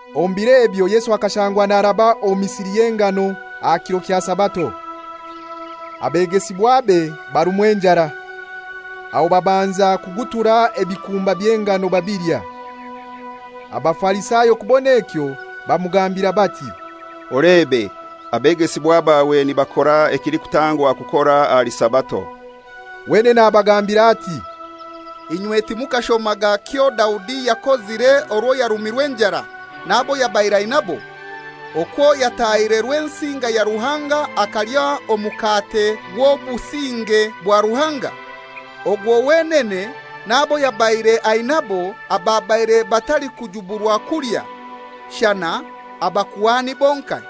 Omu biro ebyo Yesu akashangwa naraba omu misiri y'engano aha kiro kya Sabato. Abegesibwabe barumwa enjara, aho babanza kugutura ebikumba by'engano babilya. Abafarisayo kubon'ekyo, bamugambira bati, «Olebe, abegesibwa bawe nibakora ekilikutangwa kukora ahali Sabato.» Wenene abagambira ati, «Inywe timukashomaga ekyo Daudi yakozire orwo yarumirwe enjara, n'abo yabaire ainabo: okwo yatahire Rwensinga ya Ruhanga akalya Omukate gw'Obusinge bwa Ruhanga, ogwo wenene n'abo yabaire ainabo ababaire batalikujuburwa kulya, shana abakuhani bonkai?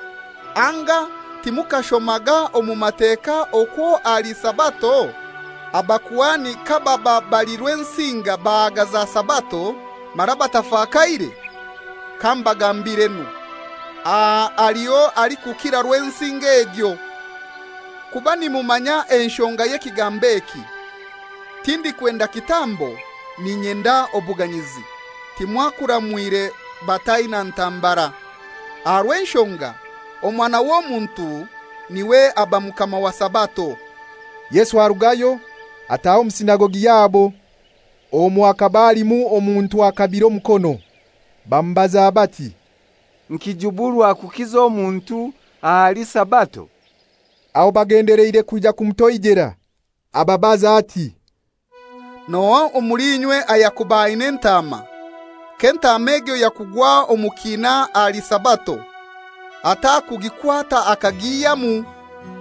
Anga timukashomaga omu Mateka okwo ahali Sabato abakuhani kababa bali Rwensinga bahagaza Sabato, mara batafakaire? Kambagambirenu, aha haliho alikukira Rwensinga egyo. Kuba nimumanya enshonga y'ekigambo eki, ‹Tindikwenda kitambo, n'inyenda obuganyizi,› timwakuramwire bataina ntambara. Aha rw'enshonga Omwana w'Omuntu niwe aba mukama wa Sabato.» Yesu arugayo, ataha omu sinagogi yabo. Omwo hakaba alimu omuntu akabire omukono. Bamubaza bati, «Nikijuburwa kukiza omuntu ahali Sabato?» Aho bagendeleire kwija kumutoijera. Ababaza ati, «N'ohai omuli inywe ayakuba aina entaama, k'entaama egyo yakugwa omu kiina ahali Sabato, atakugikwata akagihyamu?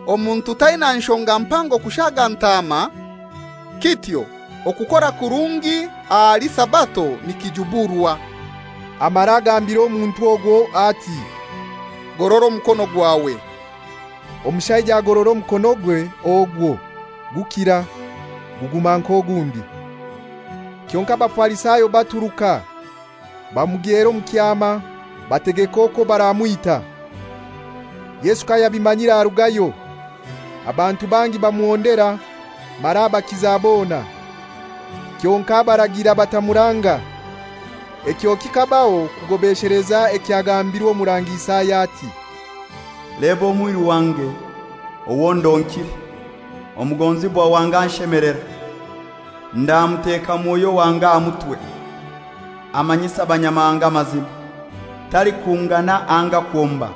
Omuntu taina nshonga mpango kushaga ntaama? Kityo okukora kurungi ahali Sabato nikijuburwa.» Amara agambira omuntu ogwo ati, «Gorora omukono gwawe.» Omushaija agorora omukonogwe ogwo, gukira, guguma nk'ogundi. Kyonkai Abafarisayo baturuka bamugyera omu kyama, bategeka okwo baramwita. Yesu kayabimanyire arugayo. Abantu bangi bamuhondera, mara abakiza bona, kyonkai abaragira batamuranga. Ekyo kikabaho kugobesheleza ekyagambirwe Omurangi Isaya ati, «Leba omwiru wange owo ndonkire, omugonzibwa wange anshemelera. Ndamuteka Mwoyo wange aha mutwe, amanyise abanyamahanga amazima. Talikungana anga kwomba,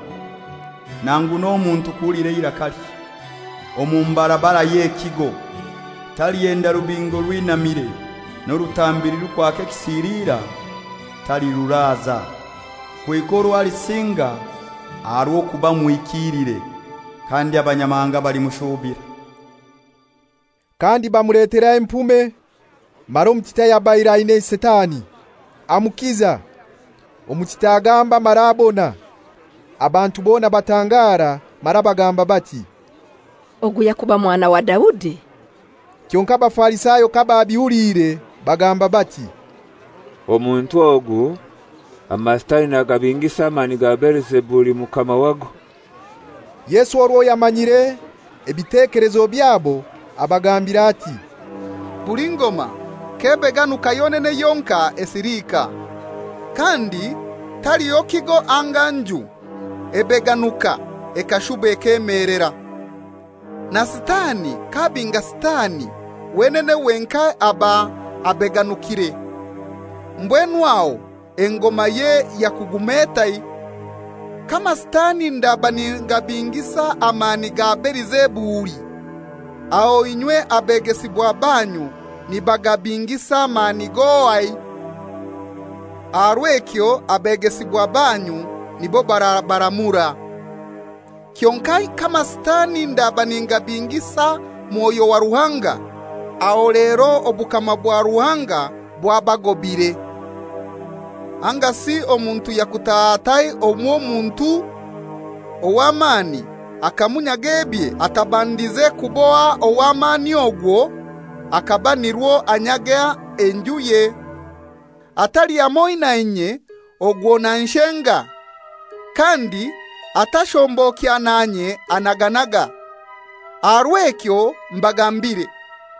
nangu n'omuntu kuhulira eirakalye omu mbarabara y'ekigo! Talihenda rubingo orwinamire, n'orutambi rulikwaka ekisiliira taliruraza, kuhika orwo alisinga aha rw'okuba muhikiilire; kandi Abanyamahanga balimushuubira.» Kandi bamuletera empume mara omutita ayabaire aina sitani, amukiza, omutita agamba mara abona. Abantu bona batangara mara bagamba bati, «Ogu yakuba mwana wa Daudi?» Kyonkai Abafarisayo kababihuliire bagamba bati, «Omuntu ogu amasitani nagabingisa amani ga Belizebuli, mukama wago.» Yesu orwo yamanyire ebitekelezo byabo abagambira ati, «Buli ngoma k'ebeganuka yonene yonkai esiliika. Kandi taliho kigo anga nju ebeganuka ekashuba ekemelera. Na Sitani k'abinga Sitani, wenene wenkai aba abeganukire. Mbwenu aho engomaye yakuguma etai? K'amasitani ndaba ningabingisa amani ga Belizebuli, aho inywe banyu abegesibwa nibagabingisa amani g'ohai? Aha rw'ekyo banyu nibo abegesibwa barabaramura. Kyonkai k'amasitani ndaba ningabingisa Mwoyo wa Ruhanga, aho lero obukama bwa Ruhanga bwabagobire. Angasi omuntu yakutaha atai omw'Omuntu ow'amani akamunyaga ebye atabandize kuboha ow'amani ogwo akaba nirwo anyaga enjuye? Atali hamoi nanye ogwo nanshenga, kandi atashombokya nanye anaganaga. Aha rw'ekyo mbagambire,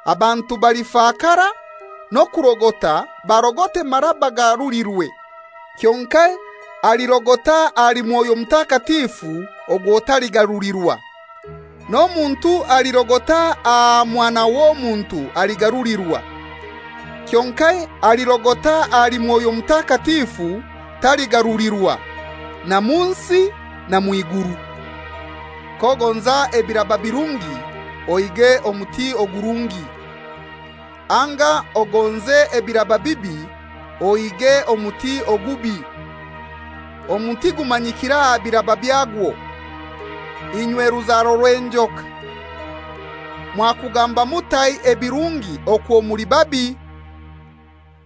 abantu balifakara n'okurogota barogote mara bagarulirwe, kyonkai alirogota ahali Mwoyo Mutakatifu ogwo taligarulirwa. N'omuntu alirogota aha Mwana w'Omuntu aligarulirwa, kyonkai alirogota ahali Mwoyo Mutakatifu taligarulirwa, na mu nsi na mw'iguru.» «K'ogonza ebiraba birungi, ohiige omuti ogurungi; anga ogonze ebiraba bibi, ohiige omuti ogubi. Omuti gumanyikira aha biraba byagwo. Inywe ruzaro rw'enjoka! Mwakugamba mutai ebirungi okwo muli babi?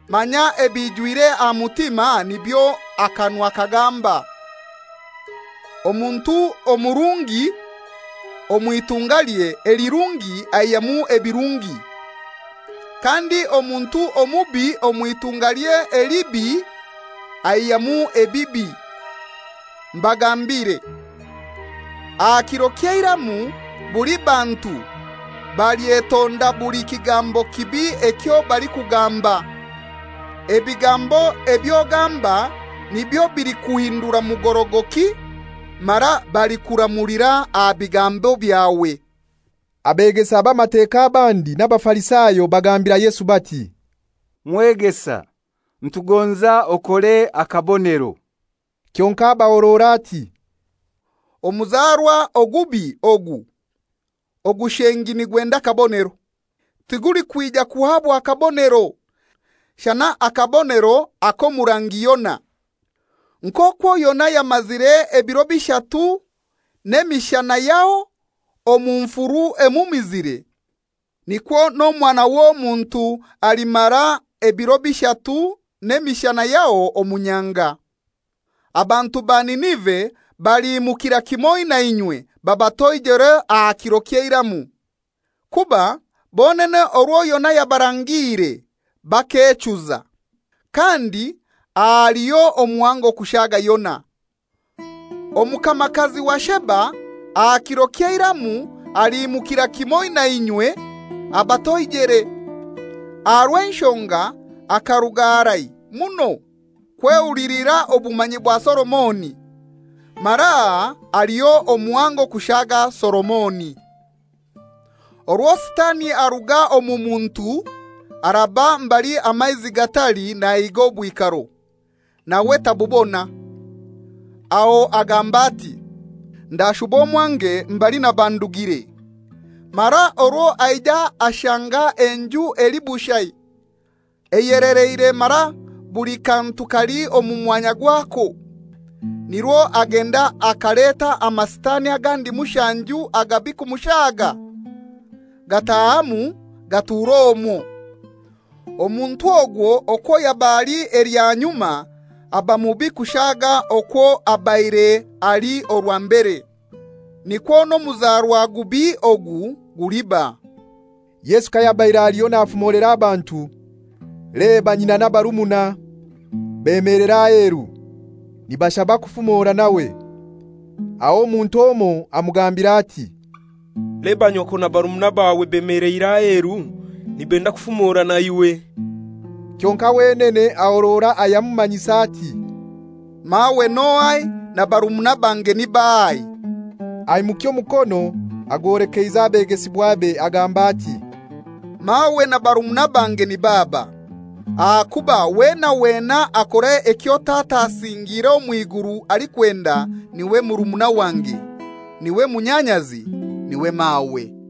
Manya ebijwire aha mutima nibyo akanwa kagamba. Omuntu omurungi omw'itungalye elirungi aihyamu ebirungi. Kandi omuntu omubi omw'itungalye elibi aihyamu ebibi. Mbagambiire, aha kiro ky'eiramu buli bantu balyetonda buli kigambo kibi ekyo balikugamba. Ebigambo eby'ogamba nibyo bilikuhindura mugorogoki mara balikuramulira aha bigambo byawe.» Abegesa b'Amateka abandi n'Abafarisayo bagambira Yesu bati, «Mwegesa, nitugonza okore akabonero.» Kyonkai abahorora ati, «Omuzarwa ogubi ogu ogushengi nigwenda akabonero; tigulikwija kuhabwa kabonero, shana akabonero ak'omurangi Yona. Nk'okwo Yona yamazire ebiro bishatu n'emishana yaho omu nfuru emumizire, nikwo n'Omwana w'Omuntu alimara ebiro bishatu n'emishana yaho omu nyanga. Abantu ba Ninive baliimukira kimoi na inywe babatoijere aha kiro ky'eiramu, kuba bonene orwo Yona yabarangiire bakechuza, kandi haliho omuhango kushaga Yona. Omukamakazi wa Sheba aha kiro ky'eiramu aliimukira kimoi na inywe abatoijere, aha rw'enshonga akaruga harai muno kwehulilira obumanyi bwa Solomoni, mara aha haliho omuhango kushaga Solomoni.» «Orwo Sitani aruga omu muntu araba mbali amaizi gatali nahiga obwikaro, nawe tabubona. Aho agamba ati, ‹Ndashuba omwange mbali naba ndugire.› Mara orwo aija ashanga enjuye eli bushai, eyeleleire mara buli kantu kali omu mwanya gwako. Nirwo agenda akaleta amasitani agandi mushanju agabi kumushaga, gatahamu gatur'omwo. Omuntu ogwo okwo yaba ali elya nyuma aba mubi kushaga okwo abaire ali orwa mbere. Nikwo n'omuzarwa gubi ogu guliba.» Yesu kayabaire aliho nafumolera abantu, leba nyina n'abarumuna bemelera aheru, nibashaba kufumora nawe. Aho omuntu omoi amugambira ati, «Leba nyoko na barumuna bawe bemeleire aheru, nibenda kufumora naiwe.» Kyonkai wenene ahorora ayamumanyisa ati, «Mawe n'ohai na barumuna bange ni bahai?» Aimukya omukono agwolekeize abegesibwabe, agamba ati, «Mawe na barumuna bange nib'aba! Ahakuba wena wena akora ekyo Tata asingiire omw'iguru alikwenda niwe murumuna wange, niwe munyanyazi, niwe mawe.»